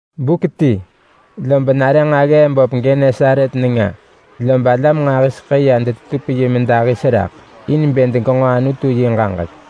Buk ti, lob nare nġaggee böp Genesaret nenga, lob alam nġahiseḳë ya detetup yi medahis raḳ, in bë degenġo Anutu yi ġaġek.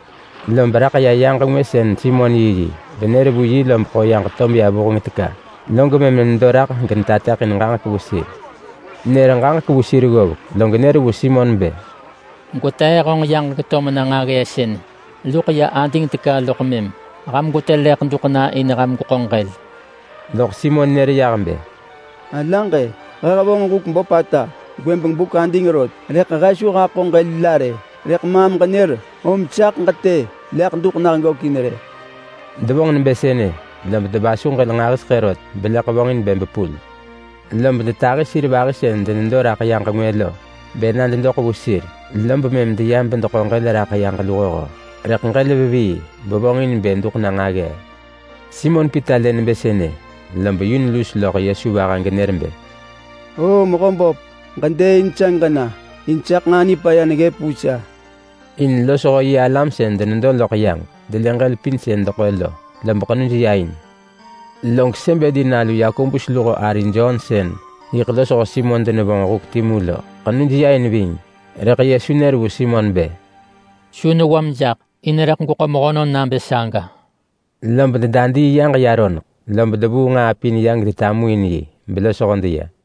Lob raḳ ya yaġ ngwë sën Simon yiyi, benër vu yi lob ḳo yaġ to meya vuheng teka, log mëm nedo raḳ genetateḳin ġaġek vu sir. Nër ġaġek vu sir ggovek, log nër vu Simon bë, “Gwetee honġ yaġ geto mena nġaggee sën luḳ ya ading teka loḳ mëm ham gwetë leḳ duḳ na in ham gweḳo ġël.” Loḳ Simon nër yah bë, “Alaġ, he hevonġ huk böpata gwëbeng buk ading rot, rëḳ he su haḳo ġël la rë. Rëḳ maam ġenër om saḳ ġetë leḳ duḳ nah gökin rë.” Devonġ nebë sënë, lob devasu ġël nġahiseḳë rot beleḳ vonġin bë bepul. Lob detahi sir vahi sën denedo raḳ yaġ ngwë lo bë na dedoḳ vu sir. Lob mëm deya bedeḳo ġël raḳ yaġ luhoho, rëḳ ġël vevii bevonġin bë duḳ na nġaggee. Simon Pita lë nebë sënë, lob yun lus loḳ Yesu vaha genër bë, “Oo-o, Mehöböp! Ġedëëin sa geġena! In saḳ nġaa nipaya neggëp vu sa.” In losho yi alam sën denedo loḳ yaġ delë ġël pin sën deḳo lo, lob ḳenuj ya in. Log Sebedi nalu Yakobus luho ari Jon sën yiḳ losho Simon denevonġ huk timu lo, ḳenuj ya in ving. Rëḳ Yesu nër vu Simon bë, “Su newam jaḳ, in rëḳ gweḳo mehönon nabë saga.” Lob dedadii yaġ ya roneḳ, lob devuu nġaa pin ya gedetamuin yi, belosho deya.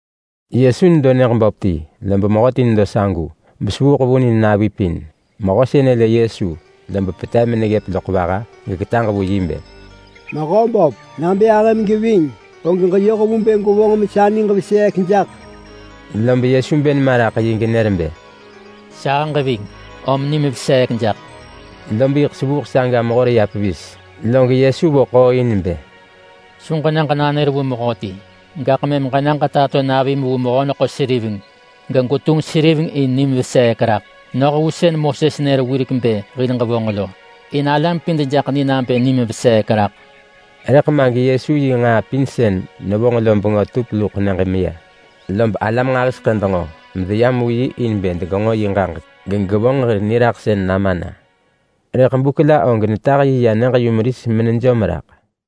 Yesu nedo nyëġ böp ti, lob mehöti nedo sagu, besevuuḳ vunin navi pin. Mehö sënë lë Yesu, lob petev meneggëp loḳ vaha geketaġ vu yi bë, “Mehöböp! Nabë ahëm geving, og ġeyoh vu bë gwevonġ mesa niġ veseek jaḳ.” Lob Yesu bë nema raḳ yi genër bë, “Sahëġ ving, om nim veseek jaḳ!” Lob yiḳ sevuuḳ saga mehor ya pevis. Log Yesu vo ḳooin bë, “Su ġena ġenanër vu mehöti. Gaḳ mëm ġena ġetato navim vu mehö-neḳo-seriveng, gegwetunġ seriveng in nim veseek raḳ. Noh vu sën Moses nër wirek bë hil ġevonġ lo. In alam pin dejaḳ ni nabë nim veseek raḳ.” Rëḳ ma geYesu yi nġaa pin sën nevonġ lo bengö tup luḳ nyëġ meya. Lob alam nġahiseḳë denġo medeyam vu yi in bë degenġo yi ġaġek gegevonġ hir niraḳsën nama na. Rëḳ buk la og netah yi ya nyëġ-yumeris menejom raḳ.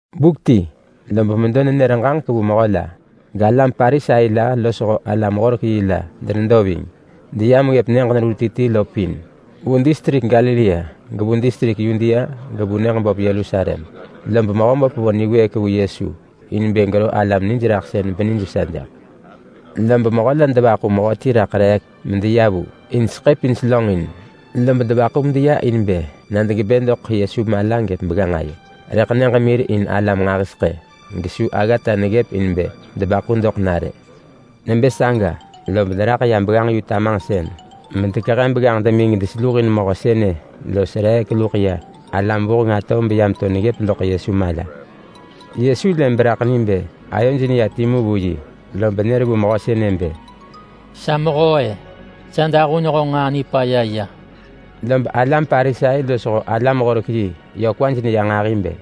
Buk ti, lob medo nenër ġaġek vu mehö la, galam Parisai la losho alam-horek-yi la denedo ving. Deyam ggëp nyëġ neru ti ti lo pin. Vu distrik Galilea, gevu distrik Yudea gevu nyëġ böp Yerusalem. Lob Mehöböp vo niwëëk vu Yesu in bë gero alam nijraḳsën benijvesa jaḳ. Lob mehö la devaḳu mehö ti raḳ reek medeya vu in seḳë pin selönġin. Lob devaḳu medeya in bë na degebë doḳ Yesu mala gëp begganġ ayo, rëḳ nyëġ mir in alam nġahiseḳë, gesu aggata neggëp in bë debaḳu doḳ na rë. Nebë saga, lob deraḳ ya begganġ demi tamanġsën medekehe begganġ demi gedeseluhin mehö sënë los reek luḳ ya alam vuheng atov beya meto neggëp loḳ Yesu mala. Yesu lë beraḳ ni bë ayoj neya timu vu yi, lob nër vu mehö sënë bë, “Sa mehö-e! Sa dahun honġ nġaa nipaya ya.” Lob alam Parisai losho alam-horek-yi yö kwaj neya nġahi bë,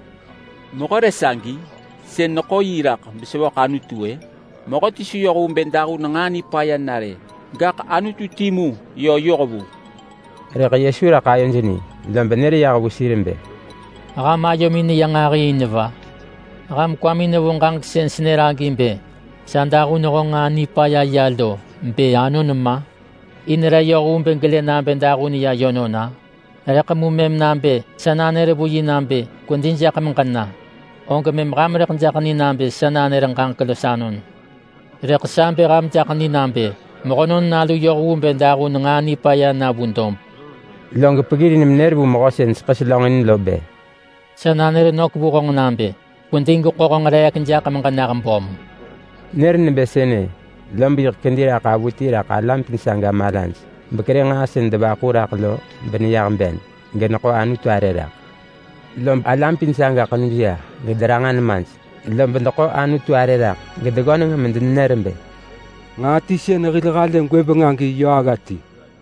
“Mehö re sagi, sën neḳo yi raḳ besevöḳ Anutu-ë? Mehöti su yoh vu bë dahun nġaa nipaya na rë, gaḳ Anutu yö timu yoh vu.” Rëḳ Yesu raḳ ayoj ni, lob nër yah vu sir bë, “Ham ayomin neya nġahi in va? Ham kwamin nevo ġaġek sën senër agi bë, ‘Sa dahun honġ nġaa nipaya ya’ lo bë anon ma, in re yoh vu bë gelë nabë dahun ya yönon-a? Rëḳ mu mëm nabë sa nanër vu yi nabë, ‘Kwedi jaḳ meġena!’ og mëm ham rëḳ jaḳ ni nabë sa nanër ġaġek los anon. Rëḳ sa bë ham jaḳ ni nabë Mehönon Nalu yoh vu bë dahun nġaa nipaya na vu dob.” Log peggirin menër vu mehö sën seḳë selönġin lo bë, “Sa nanër nök vu honġ nabë: Kwedi gweḳo honġ reek jaḳ meġenah böm.” Nër nebë sënë, lob yiḳ kedi raḳ avuti raḳ alam pin saga malaj, bekerë nġaa sën devaḳu raḳ lo beneyah ben, geneḳo Anutu arë raḳ. Lob alam pin saga ḳenuj ya gederanġa nemaj. Lob deḳo Anutu arë raḳ, gedeggöneng medenenër bë, “Nġaa ti sën hil halë gwëbeng agi yö agga ti.”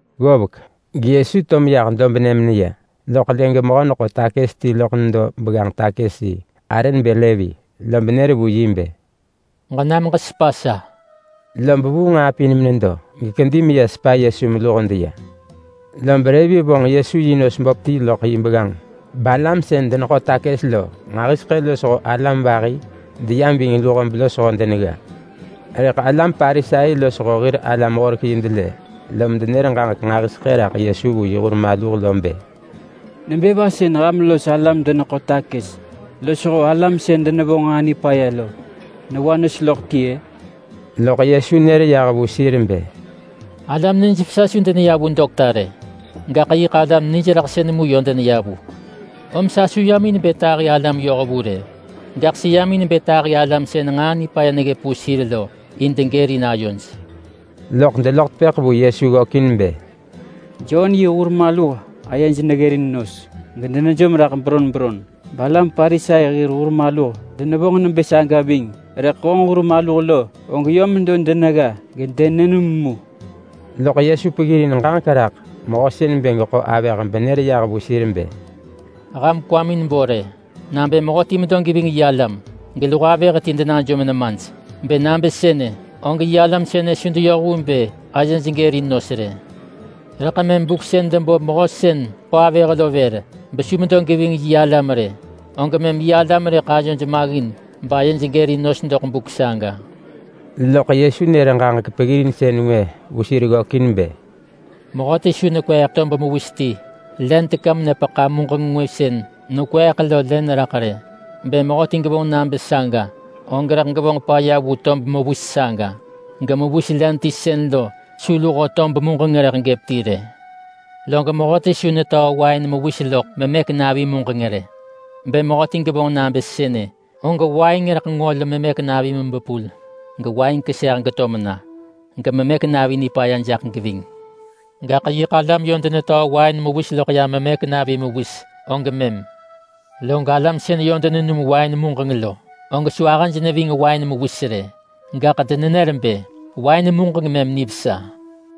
Ggovek, geYesu to meyah dobnë meneya, loḳ lë gemehö sën neḳo takës lo ti loḳ nedo begganġ-takës-yi. Arë nebë Levi. Lob nër vu yi bë, “Ġenam ġesepa sa.” Lob vuu nġaa pin menedo, gekedi meya sepa Yesu meluho deya. Lob Levi vonġ Yesu yi nos böp ti loḳ yi begganġ, balam sën deneḳo takës lo nġahiseḳë losho alam vahi deyam ving luho belosho denegga. Rëḳ alam Parisai losho hir alam-horek-yi delë, lom denër ġaġek nġahiseḳë raḳ Yesu vu yi hur maluh lo bë, “Nebë va sën ham los alam-deneḳo-takës losho alam sën denevonġ nġaa nipaya lo newa nos loḳ ti-ë?” Loḳ Yesu nër yah vu sir bë, “Alam nijvesa su deneya vu dokta rë. Gaḳ yiḳ alam nijraḳsën mu yö deneya vu. Om sa su yam in bë tahi alam-yohvu rë. Gaḳ seyam in bë tahi alam sën nġaa nipaya neggëp vu sir lo in degërin ayoj.” Loḳ deloḳ tepëḳ vu Yesu ggökin bë, “Jon yi hur maluh ayej deneggërin nos gedenejom raḳ beron beron, balam Parisai hir hur maluh denevonġ nebë saga ving. Rëḳ honġ hur maluh, og yö medo denegga gedenenum mu.” Loḳ Yesu peggirin ġaġek raḳ mehö sën neḳo avëh lo benër yah vu sir bë, “Ham kwamin bo rë, nabë mehöti medo geving yi alam geluho avëh ti denajom nemaj. Bë nabë sënë, og yi alam sënë su deyoh vu bë ayej gërin nos rë. Rëḳ mëm buk sën debo mehö sën ḳo avëh lo vër, besu medo geving yi alam rë, og mëm yi alam rëḳ ayoj maggin bayej gërin nos doḳ buk saga.” Loḳ Yesu nër ġaġek peggirinsën ngwë vu sir ggökin bë, “Mehöti su nekweeḳ tob mewis ti len teka menepeḳa muġeng ngwë sën nekweeḳ lo len raḳ rë. Bë mehöti gevonġ nabë saga, og rëḳ gevonġ paya vu tob mewis saga, gemewis len ti sën lo su luho tob muġeng rëḳ gëp ti rë. Log mehöti su netöö wain mewis loḳ memëk navi muġeng rë. Bë mehöti gevonġ nabë sënë, og wain rëḳ ngol memëk navi mebepul gewain keseh geto mena. Gememëk navi nipaya jaḳ geving. Gaḳ yiḳ alam yö denetöö wain mewis loḳ ya memëk navi mewis og mëm. Log alam sën yö denenum wain muġeng lo, og su ahëj neving wain mewis rë. Gaḳ denenër bë, ‘Wain muġeng mëm nivesa.’”